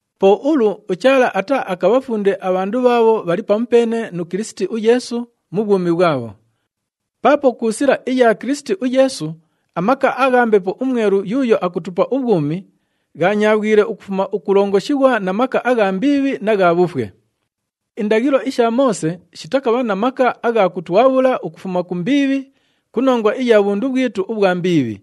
Po ulu uChaala ataaakabhafunde abhandu bhaabho bhali pamupeene nu Kilisiti uYeesu mu bhwumi bhwabho. Paapo ku sila iya Kilisiti uYeesu, amaka agha Mbepo uMwelu yuuyo akutupa ubhwumi ghanyaabhwile ukufuma ukulongoshighwa na maka agha mbiibhi na gha bhufwe. Indaghilo isha Moose shitakabha na maka agha kutwabhula ukufuma ku mbiibhi ku nongwa iya bhundu bhwitu ubhwa mbiibhi.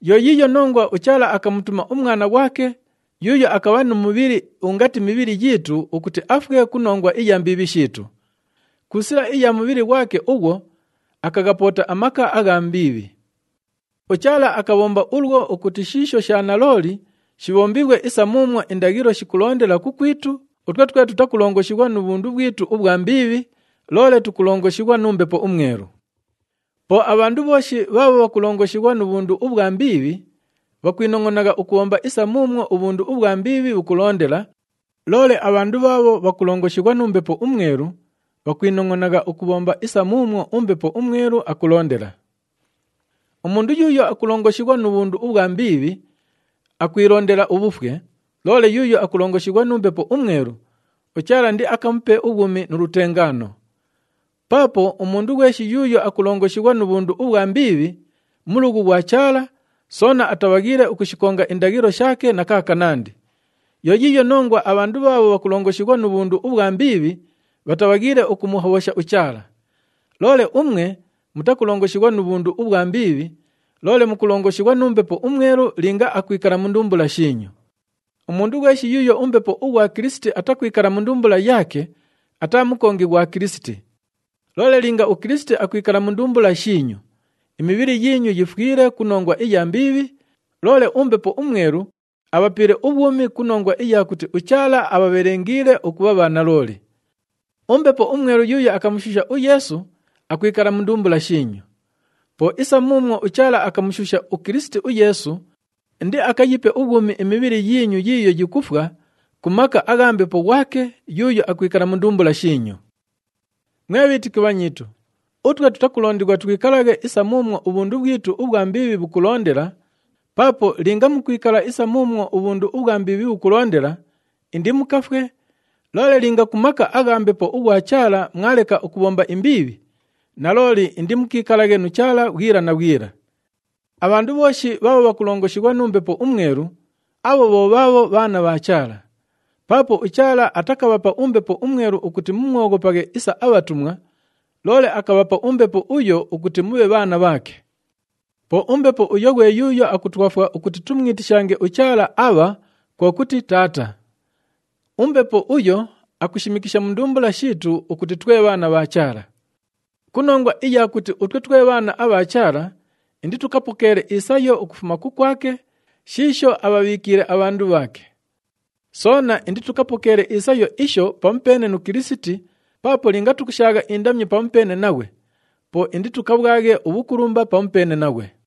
Yo yiiyo nongwa uChaala akamutuma uMwana ghwake yuuyo akabha nu mubhili ungati mibhili yiitu ukuti afwe ku nongwa iya mbiibhi shiitu. Ku sila iya mubhili ghwake ughwo, akaghapoota amaka agha mbiibhi. UChaala akabhomba ulwo ukuti shiisho sha nalooli shibhombighwe isa muumwo indaghilo shikulondela kukwitu utwe twe tutakulongoshighwa nu bhundu bhwitu ubhwa mbiibhi, loole tukulongoshighwa nu Mbepo uMwelu. Po abhandu bhooshi bhaabho bhakulongoshighwa nu bhundu ubhwa mbiibhi, bhakwinongʼonagha ukubhomba isa muumwo ubhundu ubhwa mbiibhi bhukulondela, loole abhandu bhaabho bhakulongoshighwa nu Mbepo uMwelu, bhakwinongʼonagha ukubhomba isa muumwo uMbepo uMwelu akulondela. Umundu yuuyo akulongoshighwa nu bhundu ubhwa mbiibhi, akwilondela ubhufwe, loole yuuyo akulongoshighwa nu Mbepo uMwelu, uChaala indiakamupe ubhwumi nu lutengaano. Paapo umundu ghweshi yuuyo akulongoshighwa nu bhundu ubhwa mbiibhi, mulughu ghwa Chaala, soona atabhaghiile ukushikonga indaghilo shaake na kaakanandi. Yo yiiyo nongwa abhandu bhaabho bhakulongoshighwa nu bhundu ubhwa mbiibhi, bhatabhaghiile ukumuhobhosha uChaala. Loole umwe mutakulongoshighwa nu bhundu ubhwa mbiibhi, loole mukulongoshighwa nu Mbepo uMwelu linga akwikala mu ndumbula shiinyu. Umundu ghweshi yuuyo uMbepo ughwa Kilisiti atakwikala mu ndumbula yaake ataa mukongi ghwa Kilisiti. Loole linga uKilisiti akwikala mu ndumbula shiinyu, imibhili yiinyu yifwile ku nongwa iya mbiibhi, loole uMbepo uMwelu abhapiile ubhwumi ku nongwa iya kuti uChaala abhabhelengiile ukubha bhanalooli. UMbepo uMwelu yuuyo akamushuusha uYeesu akwikala mu ndumbula shiinyu. Po isa muumwo uChaala akamushuusha uKilisiti uYeesu, indiakayipe ubhwumi imibhili yiinyu yiiyo yikufwa ku maka agha Mbepo ghwake yuuyo akwikala mu ndumbula shiinyu. Mwe bhiitiki bhanyiitu, utwe tutakulondighwa twikalaghe isa muumwo ubhundu bhwitu ubhwa mbiibhi bhukulondela, paapo linga mukwikala isa muumwo ubhundu ubhwa mbiibhi bhukulondela, indimukafwe, loole linga ku maka agha Mbepo ughwa Chaala mwaleka ukubhomba imbiibhi, nalooli indimukiikalaghe nu Chaala bhwila na bhwila. Abhandu bhooshi bhaabho bhakulongoshighwa nu Mbepo uMwelu, abho bho bhaabho bhaana bha Chaala. Paapo uChaala atakabhapa uMbepo uMwelu ukuti mumwoghopaghe isa abhatumwa, loole akabhapa uMbepo uyo ukuti mubhe bhaana bhaake. Po uMbepo uyo ghwe yuuyo akutwafwa ukuti tumwitishange uChaala “Aabha,” kwo kuti, “Taata.” UMbepo uyo akushimikisha mu ndumbula shiitu ukuti twe bhaana bha Chaala. Ku nongwa iya kuti utwe twe bhaana abha Chaala, inditukapokeele isayo ukufuma kukwake shiisho abhabhiikiile abhandu bhaake. Soona inditukapokeele isayo isho pamupeene nu Kilisiti paapo linga tukushaagha indamyo pamupeene naghwe, po inditukabhwaghe ubhukulumba pamupeene naghwe.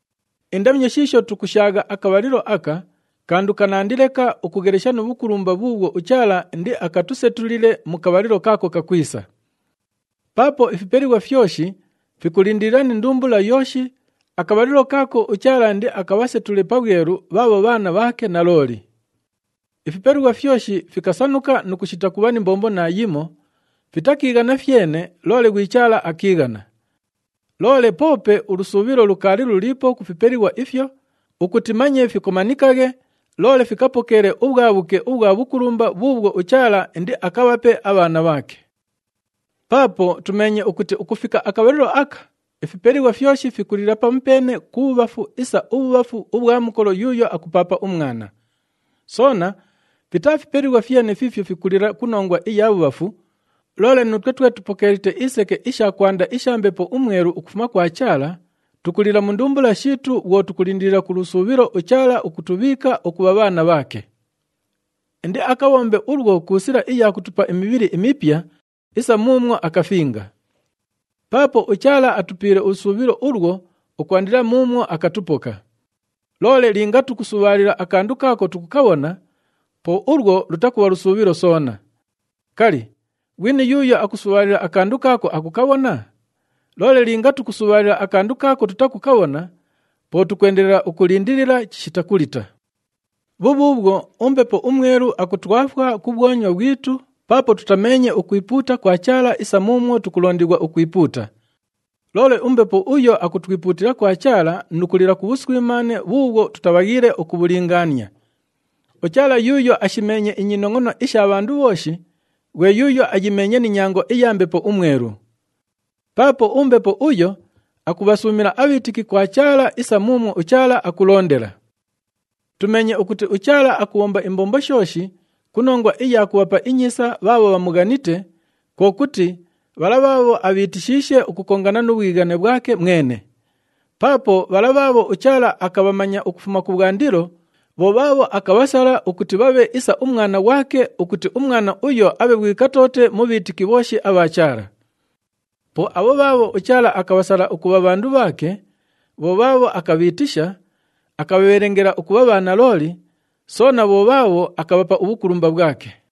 Indamyo shiisho tukushaagha akabhalilo aka kandu kanandi leka ukughelesha nu bhukulumba bhuubhwo uChaala indiakatusetulile mu kabhalilo kaako kakwisa. Paapo ifipelighwa fyoshi fikulindilila ni ndumbula yooshi akabhalilo kaako uChaala indiakabhasetule pabhwelu bhaabho bhaana bhaake nalooli. Ifipelighwa fyoshi fikasanuka nu kushita kubha ni mbombo naayimo, fitakiighana fyene, loole ghwi Chaala akiighana. Loole poope ulusuubhilo lukaali luliipo ku fipelighwa ifyo, ukuti manye fikomanikaghe, loole fikapokeele ubhwabhuke ubhwa bhukulumba bhuubhwo uChaala indiakabhape abhaana bhaake. Paapo tumeenye ukuti ukufika akabhalilo aka, ifipelighwa fyoshi fikulila pamupeene ku bhubhafu isa ubhubhafu ubhwa mukolo yuuyo akupaapa umwana. Soona fitaa fipelighwa fyene fiifyo fikulila ku nongwa iya bhubhafu, loole nuutwe twe tupokeelite iseke isha kwanda isha Mbepo uMwelu ukufuma kwa Chaala, tukulila mu ndumbula shiitu, bhwo tukulindilila ku lusuubhilo uChaala ukutubhiika ukubha bhaana bhaake. Indiakabhombe ulwo ku sila iya kutupa imibhili imipya isa muumwo akafinga. Paapo uChaala atupiile ulusuubhilo ulwo ukwandila muumwo akatupoka. Loole linga tukusubhaalila akandu kaako tukukabhona, po ulwo lutakubha lusuubhilo soona. Kali, ghwini yuuyo akusubhaalila akandu kaako akukabhona? Loole linga tukusubhaalila akandu kaako tutakukabhona, po tukwendelela ukulindilila chishita kulita. Bhubhuubhwo, uMbepo uMwelu akutwafwa ku bhwonywa bhwitu paapo tutameenye ukwipuuta kwa Chaala isa muumwo tukulondighwa ukwipuuta. Loole uMbepo uyo akutwipuutila kwa Chaala nu kulila ku bhuswimaane bhuubhwo tutabhaghiile ukubhulingaania. UChaala yuuyo ashimeenye inyinongʼono isha bhandu bhooshi, ghwe yuuyo ayimeenye ni nyango iya Mbepo uMwelu. Paapo uMbepo uyo akubhasuumila abhiitiki kwa Chaala isa muumwo uChaala akulondela. Tumeenye ukuti uChaala akubhomba imbombo shooshi ku nongwa iya kubhapa inyiisa bhaabho bhamughanite, kwo kuti bhala bhaabho abhiitishiishe ukukongana nu bhwighane bhwake mwene. Paapo bhala bhaabho uChaala akabhamanya ukufuma kubhwandilo, bho bhaabho akabhasala ukuti bhabhe isa uMwana ghwake ukuti uMwana uyo abhe ghwi katoote mu bhiitiki bhooshi abha Chaala. Po abho bhaabho uChaala akabhasala ukubha bhandu bhaake, bho bhaabho akabhiitisha, akabhabhelengela ukubha bhanalooli, soona bho bhaabho akabhapa ubhukulumba bhwake.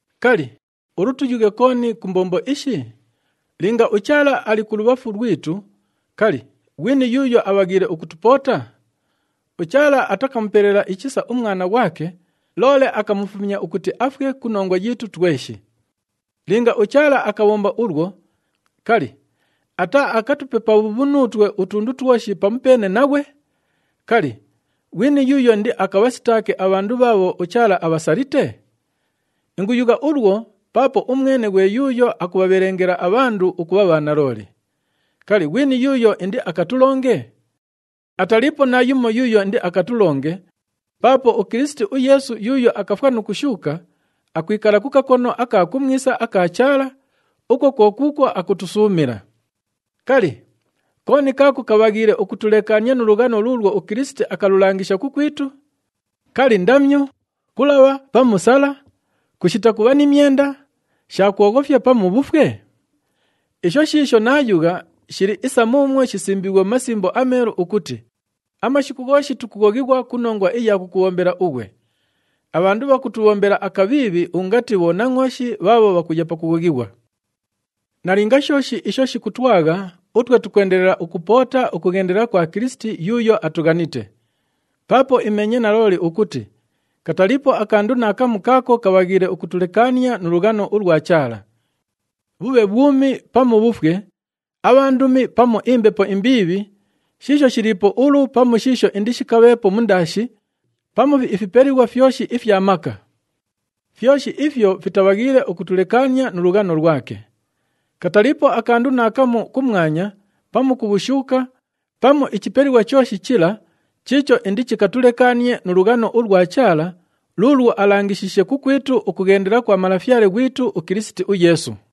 Kali, ulu tuyughe kooni ku mbombo ishi? Linga uChaala ali kulubhafu lwitu, kali, ghwini yuuyo abhaghiile ukutupoota? UChaala atakamupelela ichisa uMwana ghwake, loole akamufumya ukuti afwe ku nongwa yiitu tweshi. Linga uChaala akabhomba ulwo, kali, ataaakatupe pabhuubhu nuutwe utundu twoshi pamupeene naghwe? Kali, ghwini yuuyo indiakabhasitaake abhandu bhaabho uChaala abhasalite? Inguyugha ulwo paapo umwene ghwe yuuyo akubhabhelengela abhandu ukubha bhanalooli. Kali, ghwini yuuyo indiakatulonge? Ataliipo naayumo yuuyo indiakatulonge paapo uKilisiti uYeesu yuuyo akafwa nu kushuuka, akwikala ku kakono aka kumwisa aka Chaala, ukwo kwo kuukwo akutusuumila. Kali, kooni kaako kabhaghiile ukutulekaania nu lughano luulwo uKilisiti akululangisha kukwitu? Kali, ndamyo, kulabha pamu sala, kushita kubha ni myenda, sha kwoghofya pamu bhufwe? Isho shiisho naayugha shili isa muumwo shisimbiighwe mu Masimbo aMeelu ukuti, “Amashiku ghooshi tukughoghighwa ku nongwa iya kukubhombela ughwe. Abhandu bhakutubhombela akabhiibhi ungati bhonangʼooshi bhaabho bhakuya pakughoghighwa.” Nalinga shooshi isho shikutwagha, utwe tukwendelela ukupoota ukughendela kwa Kilisiti yuuyo atughanite. Paapo imeenye nalooli ukuti kataliipo akandu naakamu kaako kabhaghiile ukutulekaania nu lughano ulwa Chaala. Bhubhe bhwumi pamu bhufwe, abhandumi pamu imbepo imbiibhi, shiisho shiliipo ulu pamu shiisho indishikabheepo mundaashi, pamu ifipelighwa fyoshi ifya maka. Fyoshi ifyo fitabhaghiile ukutulekaania nu lughano lwake. Kataliipo akandu naakamu kumwanya pamu ku bhushuuka, pamu ichipelighwa chooshi chila chiicho indichikatulekaanie nu lughano ulwa Chaala luulwo alangishiishe kukwitu ukughendela kwa Malafyale ghwitu uKilisiti uYeesu.